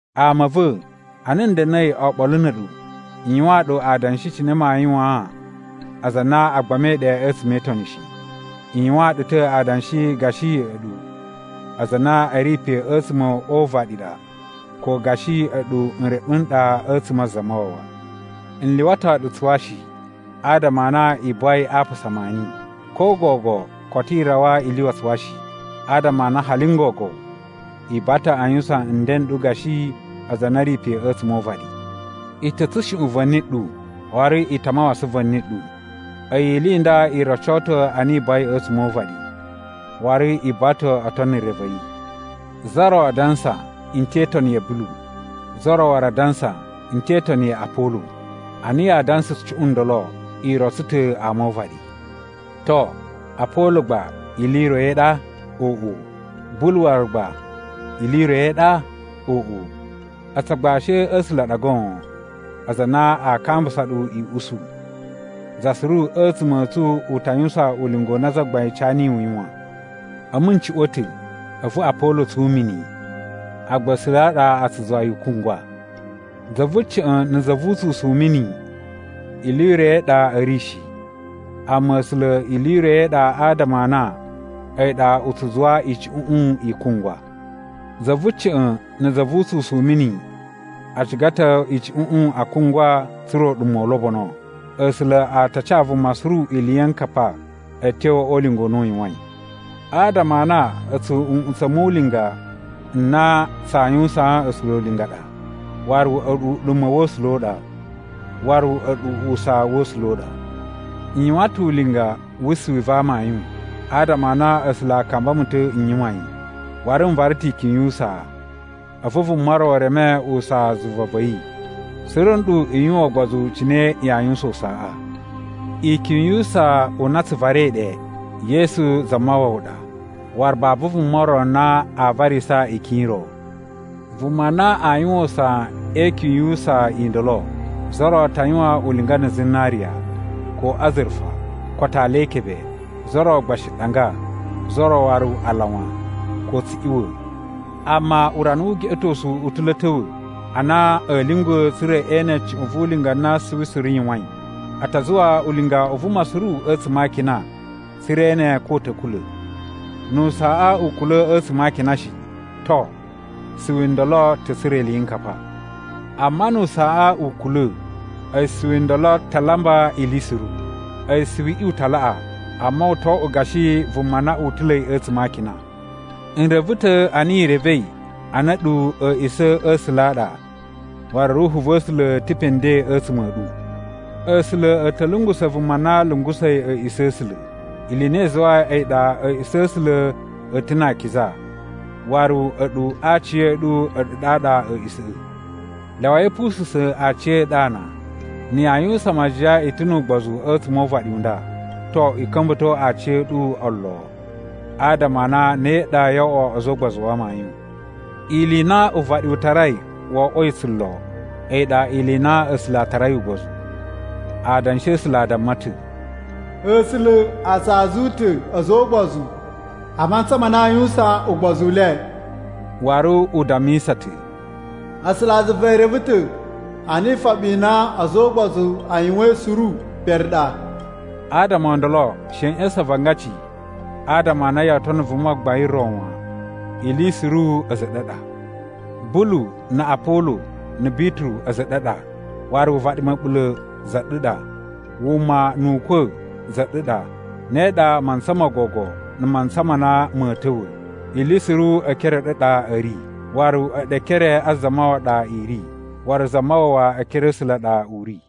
Ama a̱ va̱, ana n da̱na̱i oɓolo na̱ a̱ɗu n yuwaan ɗu adanshi cine maa yuwaan aza a na a gbamai ɗe a̱tsuma̱ e Itoni shi. N yuwaan ɗu ta̱ adanshi gashi a̱ɗu aza a na a̱ ri pe a̱tsuma̱ o uvaɗi ɗa ko gashi a̱ɗu nreɓu n ɗa a̱tsuma̱ a Zamawawa. N lyuwato ɗu tsuwa shi, adama a na i buwai a apasa maani. Ko gogo koto i rawa i lyuwa tsuwa shi, adama a na hali n gogo i buwa ta̱ a yuwusan nden n ɗu gashi aza a na a̱ ri pe a̱tsuma̱ o uvaɗi. I ta̱ tsushuꞌun va̱ni ɗu waru i ta mawasan va̱ni ɗu. A̱yi ili i nda i roco ta̱ a na i buwai a̱tsuma̱ o uvaɗi, waru i buwa ta̱ o tono re va̱ yi. Za ro a dansa, “N te itoni ya̱ Bulu.” Za ro waru a dansa, “N te itoni ya Apolo.” Ana yaa dansa cuꞌun ndolo, i rotso ta̱ ama o uvaɗi. To, Apolo gba ili i ro i ɗa? Oꞌo! Bulu waru gba ili i ro i ɗa? Oꞌo! A̱tsu agbashi a̱ A̱sula̱ a ɗa goon, aza a na aa kambusa ɗu i usu. Za suru a̱tsuma̱ a̱ tsu u ta yuwusan ulinga u na Zagbain ca niyi u yuwan. A̱mu n cuꞌwa̱n ta̱ a̱vu Apolo tsun mini. Agba A̱sula̱ a ɗa a tsu zuwa yi u kungwa. Za vu ca̱ꞌa̱n na̱ za vu utsusun u mini ili i ro i ɗa a̱ ri shi, amma A̱sula̱ ili i ro i ɗa adama a na a̱yi ɗa u tsu zuwa icuꞌuꞌun i kungwa. Za vu ca̱ꞌa̱n na̱ za vu utsusun u mini a ciga ta̱ icuꞌuꞌun a kungwa tsa̱ra̱ uɗuma̱ u lobono. A̱sula̱ a ta ca vuma suru iliyinkapa a̱tyo o ulinga u na u yuwain. Adama a na a̱tsu nꞌutsa̱ mu ulinga n na tsaa yuwusaan A̱sula̱ ulinga ɗa, waru a̱ɗu uɗuma̱ wa̱ A̱sula̱ u ɗa. Waru a̱ɗu usaa wa̱ A̱sula̱ u ɗa. N yuwan ta̱ ulinga wu suwi va amayun, adama a na A̱sula̱ a kamba mu ta̱ n yuwan yi, waru n vara ta̱ ikyun yu usaa, a̱vu vuma ro reme usaa zuva va̱ yi. Suru nɗu i yuwan ugbozu cine yaa yuwusan usaaꞌa. Ikyun yu usaa u na tsu varai ɗe, Yesu Zamawawa ɗa, waru babu vuma ro na aa varisa ikyun i ro. Vuma na a yuwan usaa e ikyun yu usaa i ndolo, za ro ta yuwan ulinga na̱ zinariya, ko azurufa, ko atali e ikebe, za ro gba shi ɗanga, za ro waru alawan, ko tsuꞌiwa̱. Amma urana wu ugeꞌetosu u ta̱ lo a̱ ta̱wa̱ a na a̱a̱ lyungwa̱ tsa̱ra̱ e ene cuꞌun vu ulinga na suwi suru yuwain. A ta zuwa ulinga u vuma suru a̱tsuma̱ a akina tsa̱ra̱ e ene ko u ta̱ kula̱. Nu usaaꞌa u kula̱ a̱tsuma̱ a akinaꞌa shi, to, suwi ndolo ta̱ tsura̱ iliyinkapa. Amma nu usaaꞌa u kula̱, a̱yi suwi ndolo ta lamba ili suru. A̱yi suwiꞌi u ta laꞌa, amma u to oꞌwo gashi vuma na utula̱i a̱tsuma̱ a akina. N reve ta̱ a na i revei a na a̱ɗu a̱a̱ꞌisa̱ a̱ A̱sula̱ a ɗa waru Ruhu va̱ A̱sula̱ ta̱ pe nden a̱tsuma̱ a̱ ɗu! A̱sula̱ a̱ ta̱ lungusa̱ vuma na lungusa̱i a̱a̱ꞌisa̱ a̱ A̱sula̱. Ili i na i zuwai a̱yi ɗa a̱a̱ꞌisa̱ a̱ A̱sula̱ a̱ ta̱ na akiza, waru a̱ɗu aciya̱ɗu a̱ɗu ɗaɗa a̱a̱ꞌisa̱ꞌa̱. Lyawai a̱ pususa̱n aciya̱ɗu ana. Na̱ yaa yuwusan majiyan i ta̱ nu ugbozu a̱tsuma̱ o uvaɗi u nda, to, i ka̱mba̱to aciya̱ɗu olo adama a na ne ɗa yoo oꞌwo a̱za̱ o ugbozu wa amayun. Ili i na uvaɗi u tarai wo oꞌwoi tsulo, a̱yi ɗa ili i na A̱sula̱ a tarai ugbozu. Adanshi a̱ A̱sula̱ a damma ta̱, “A̱sula̱ a tsa azu ta̱ a̱za̱ o ugbozu a mantsa ma na aa yuwusan ugbozu u le.” Waru u dammisa ta̱, “A̱sulazuva e reve ta̱ a na ifoɓi i na a̱za̱ o ugbozu a yuwain suru pere ɗa.” Adama o ndolo she i ꞌya̱sa̱n avangaci adama a na yoo tono vuma gbain ro wan. Ili suru a̱za̱ a̱ ɗu a ɗa: Bulu, na̱ Apolo, na̱ Bituru a̱za̱ a̱ ɗu a ɗa. Waru uvaɗi ma̱ɓula̱ za ɗu ɗa. Wuma, nu ukwa̱ za ɗu ɗa. Ne ɗa mantsa mo gogo na̱ mantsa ma na ma̱a̱ ta̱wa̱. Ili suru e ekere a̱ ɗu a ɗa a̱ ri, waru a̱ɗu e ekere a Zamawawa ɗa i ri, waru Zamawawa e ekere a̱ A̱sula̱ a ɗa u ri.